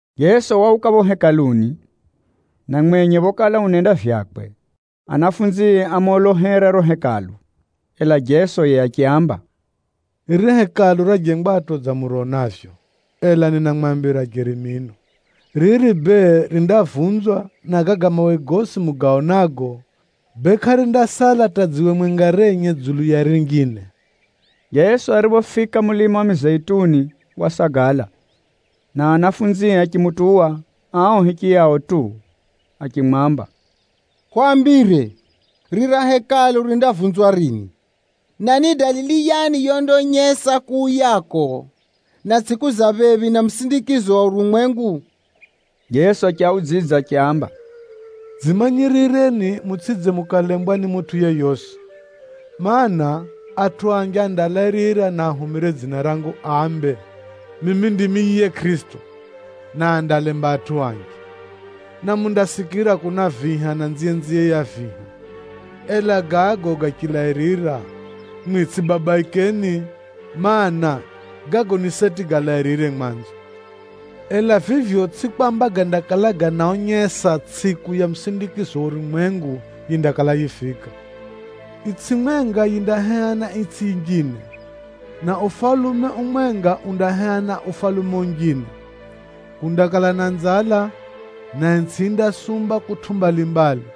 Jeso wauka phapho Hekaluni, na mwenye phokala unenda vyakwe, anafunzie ámolohera riro Hekalu. Ela Jeso yiye achiaamba, “Riri Hekalu rajengwatʼo dza muronavyo, ela ninamwambira jeri mino, riri bee, rindavunzwa, na gaga mawe gosi mugaonago, bee kʼarindasala hata dziwe mwenga renye dzulu ya rinjine.” Jeso ariphofika mulima wa Mizeituni wasagala, na anafunzie achimutuwa ao hichiyao tu achimwamba, “Hwambire, rira Hekalu rindavunzwa rini? Na ni dalili yani yondaonyesa kuuyako, na tsʼiku za phephi na musindikizo wa urumwengu?” Jeso achiaudzidza achiaamba, “Dzimanyirireni mutsʼidze mukalembwa ni mutʼu yeyosi. Maana, atʼu anji andalairira na ahumire dzina rangu ambe, ‘Mimi ndimi yiye Kʼirisito,’ na andaalemba atʼu anji. Na mundasikira kuna viha, na nziyenziye ya viha, ela gago gachilairira, mwimwi tsʼibabaikeni. Maana, gago ni seti galairire mwanzo, ela vivyo tsʼivyo kwamba gandakala ganaonyesa tsʼiku ya musindikizo wa urumwengu yindakala yifika. Itsʼi mwenga yindaheha na itsʼi yinjine, na ufalume umwenga undaheha na ufalume unjine. Kundakala na nzala, na itsʼi yindasumba kutʼu mbalimbali.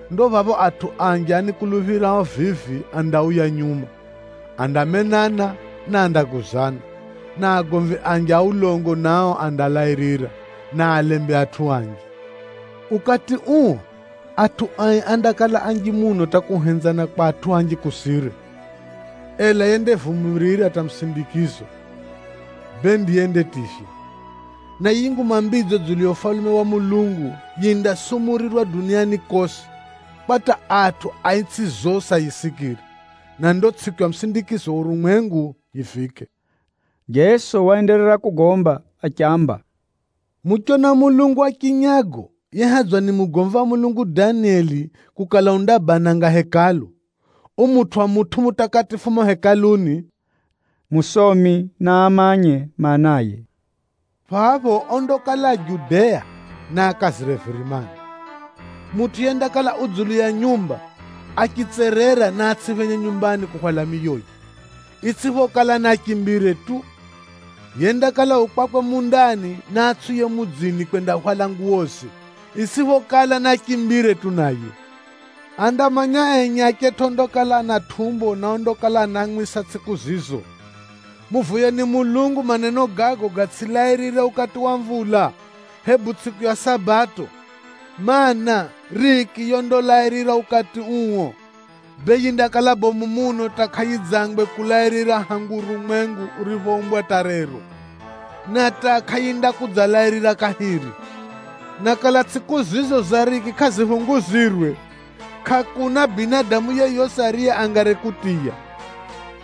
Ndo phapho atʼu anji anikuluphirao vivi andauya nyuma, andamenana na andaguzana. Na agomvi anji a ulongo nao andalairira, na aalembe atʼu anji. Ukati uo, atʼu ai andakala anji muno hata kuhenzana kwa atʼu anji kusire. Ela yendavumirira hata musindikizo, bee ndiye yendativywa. Na yiyi Nguma Mbidzo dzulu ya Ufalume wa Mulungu, yindasumurirwa duniani kosi, kwa hata atʼu a itsʼi zosi ayisikire, na ndo tsʼiku ya musindikizo wa urumwengu yifike.” Jeso waenderera kugomba achiamba, “Muchona mulungu wa chinyago yehadzwa ni mugomvi wa Mulungu Danieli kukala undabananga Hekalu, umutwʼa mutʼu mutakatifu mumo Hekaluni, (musomi naamanye maanaye), phapho ondakala a Judea, naakazire virimani. Mutʼu yendakala u dzulu ya nyumba, achitserera naatsʼiphenye nyumbani kuhwala miyoye, itsʼiphokala naachimbire tu. Yendakala u kwakwe mundani naatsʼiuye mudzini kwendahwala nguwoze, itsʼiphokala naachimbire tu naye. Andamanya enye achetʼu ondakala ana tʼumbo na ondakala anaamwisa tsʼiku zizo! Muvoyeni Mulungu maneno gago gatsʼilairire ukati wa mvula, hebu tsʼiku ya Sabato! Maana, riki yondalairira ukati uo, bee yindakala bomu muno hata kʼayidzangwe kulairira hangu urumwengu uriphoumbwa hata rero, na hata kʼayindakudzalairira kahiri. Na kala tsʼiku zizo za riki kʼaziphunguzirwe, kʼakuna binadamu yeyosi ariye angari kutiya.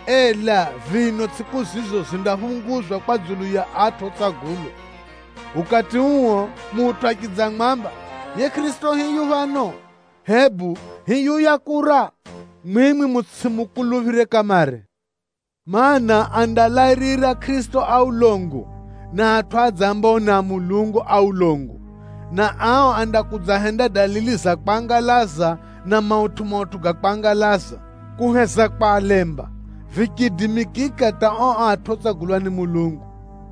Ela vino tsʼiku zizo zindaphunguzwa kwa dzulu ya atʼu otsagulwa. Ukati uo, mutʼu achidzamwamba, ‘Yiye Kʼirisito hiyu phano!’ hebu ‘Hiyuya kura!’ mwimwi mutsʼimukuluphire kamare. Maana, andalairira Kʼirisito a ulongo, na atʼu adzambao ni a Mulungu a ulongo, na ao andakudzahenda dalili za kwangalaza na mautʼu-mautʼu ga kwangalaza, kuheza kwalemba vichiidimikika hata ao atʼu otsagulwa ni Mulungu.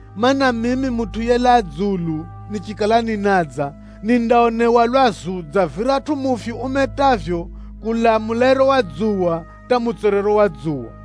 Maana, mimi Mutʼu yelaa dzulu, nichikala ninadza nindaonewa lwazu dza viratʼu mufyu umetavyo kulaa mulairo wa dzuwa, hata mutswerero wa dzuwa.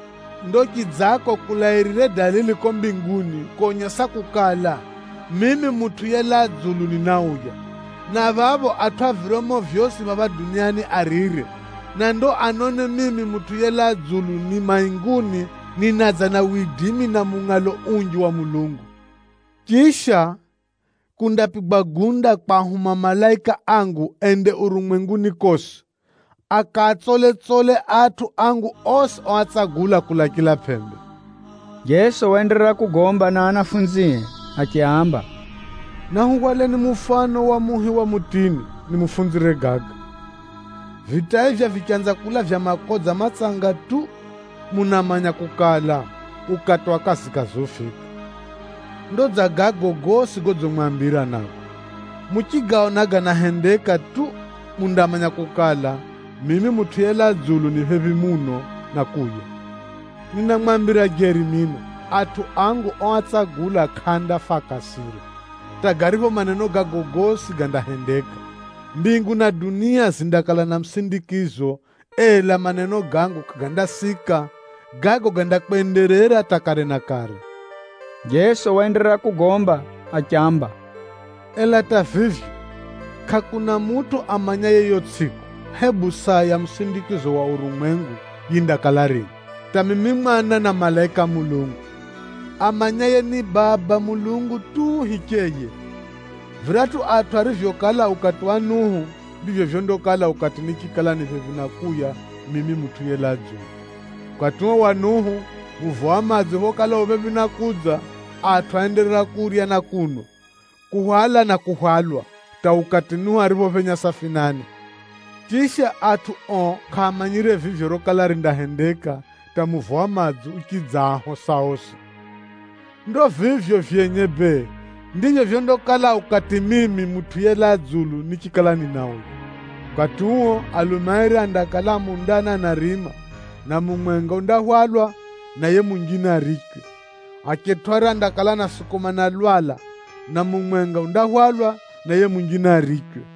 “Ndo chidzako kulairire dalili kuko mbinguni konyesa kukala, mimi Mutʼu yelaa dzulu ninauya, na phapho atʼu a viryomo vyosi phapha duniani arire, na ndipho anone mimi Mutʼu yelaa dzulu ni mainguni ninadza na widimi na mungʼalo unji wa Mulungu. Chisha, kundapigwa gunda kwahuma malaika angu ende urumwenguni kosi, akaatsole-tsole atʼu angu osi oatsagula kulaa chila pʼembe.” Jeso waenderera kugomba na anafunzie achiaamba, “Nahuhwaleni mufano wa muhi wa mutini, nimufunzire gaga. Vitaivye vichanza kulavya makodza matsanga tu, munamanya kukala, ukati wa kazikazi ufika. Ndo dza gago gosi godzimwambira nago, muchigaona ganahendeka tu, mundamanya kukala, mimi Mutʼu yelaa dzulu ni phephi muno na kuuya. Ninamwambira jeri mino, atʼu angu oatsagula kʼaandafa akasira, hata garipho maneno gago gosi gandahendeka. Mbingu na dunia zindakala na musindikizo, ela maneno gangu kʼagandasika. Gago gandakwenderera hata kare na kare.” Jeso waenderera kugomba achiamba, “Ela hata vivyo, kʼakuna mutʼu amanyaye yiyo tsʼiku, hebu saa ya musindikizo wa urumwengu yindakala rini, hata mimi Mwana na malaika a Mulungu. Amanyaye ni Baba Mulungu tu hicheye. Viratʼu atʼu arivyokala ukati wa Nuhu, ndivyo vyondakala ukati nichikala ni phephi na kuuya mimi Mutʼu yelaa dzulu. Ukati uo wa Nuhu, muvo wa madzi phokala u phephi na kudza, atʼu áenderera kurya na kunwa, kuhwala na kuhwalwa hata ukati Nuhu ariphophenya safinani, chisha atʼu ao kʼaamanyire vivyo rokala rindahendeka hata muvo wa madzi uchidzaahosa osi. Ndo vivyo vyenye bee, ndivyo vyondakala ukati mimi Mutʼu yelaa dzulu nichikala ninauya. Ukati uo, alume airi andakala a mundani anarima, na mumwenga undahwalwa, na yiye munjine arichwe. Achetʼu airi andakala anasukumana lwala, na mumwenga undahwalwa, na yiye munjine arichwe.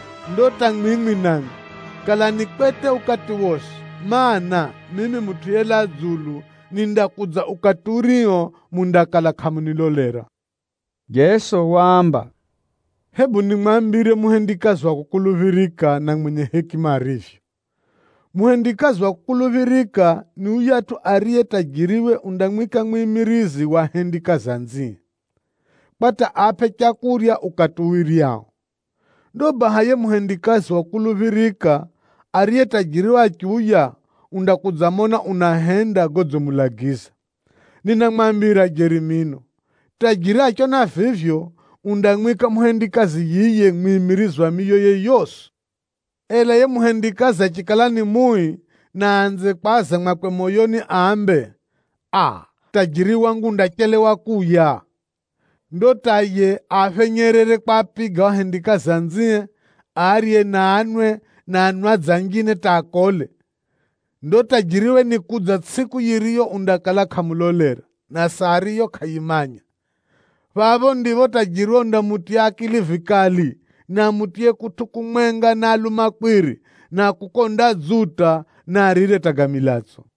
Ndo hata mwimwi namwi, kalani kwete ukati wosi, mana, mimi Mutʼu yelaa dzulu nindakudza ukati urio mundakala kʼamunilolera.” Jeso waamba, “Hebu nimwambire muhendikazi wa kukuluphirika na mwenye hekima arivyo. Muhendikazi wa kukuluphirika ni yuyatʼu ariye tajiriwe undamwika mwimirizi wa ahendikazi anzie, kwa hata aapʼe leu ukati uwiryao. Ndo baha yiye muhendikazi wa kukuluphirika, ariye tajiriwe achiuya, undakudzamona unahenda godzimulagiza. Ninamwambira jeri mino, tajiri achiona vivyo, undamwika muhendikazi yiye mwimirizi wa miyoye yosi. Ela yiye muhendikazi achikala ni mui, na aanze kwaza mwakwe moyoni ambe, ‘Aa, tajiri wangu undachelewa kuuya,’ ndo hata yiye aaphenyerere kwapiga ao ahendikazi anzie, arye na anwe na anwadzi anjine hata akole. Ndo tajiriwe nikudza tsʼiku yiriyo undakala kʼamulolera, na saa ariyo kʼayimanya. Phapho ndipho tajiriwe undamutiya akili vikali, na amutiye kutʼu kumwenga na alumakwiri, na kuko andadzuta, na arire hata ga milatso.”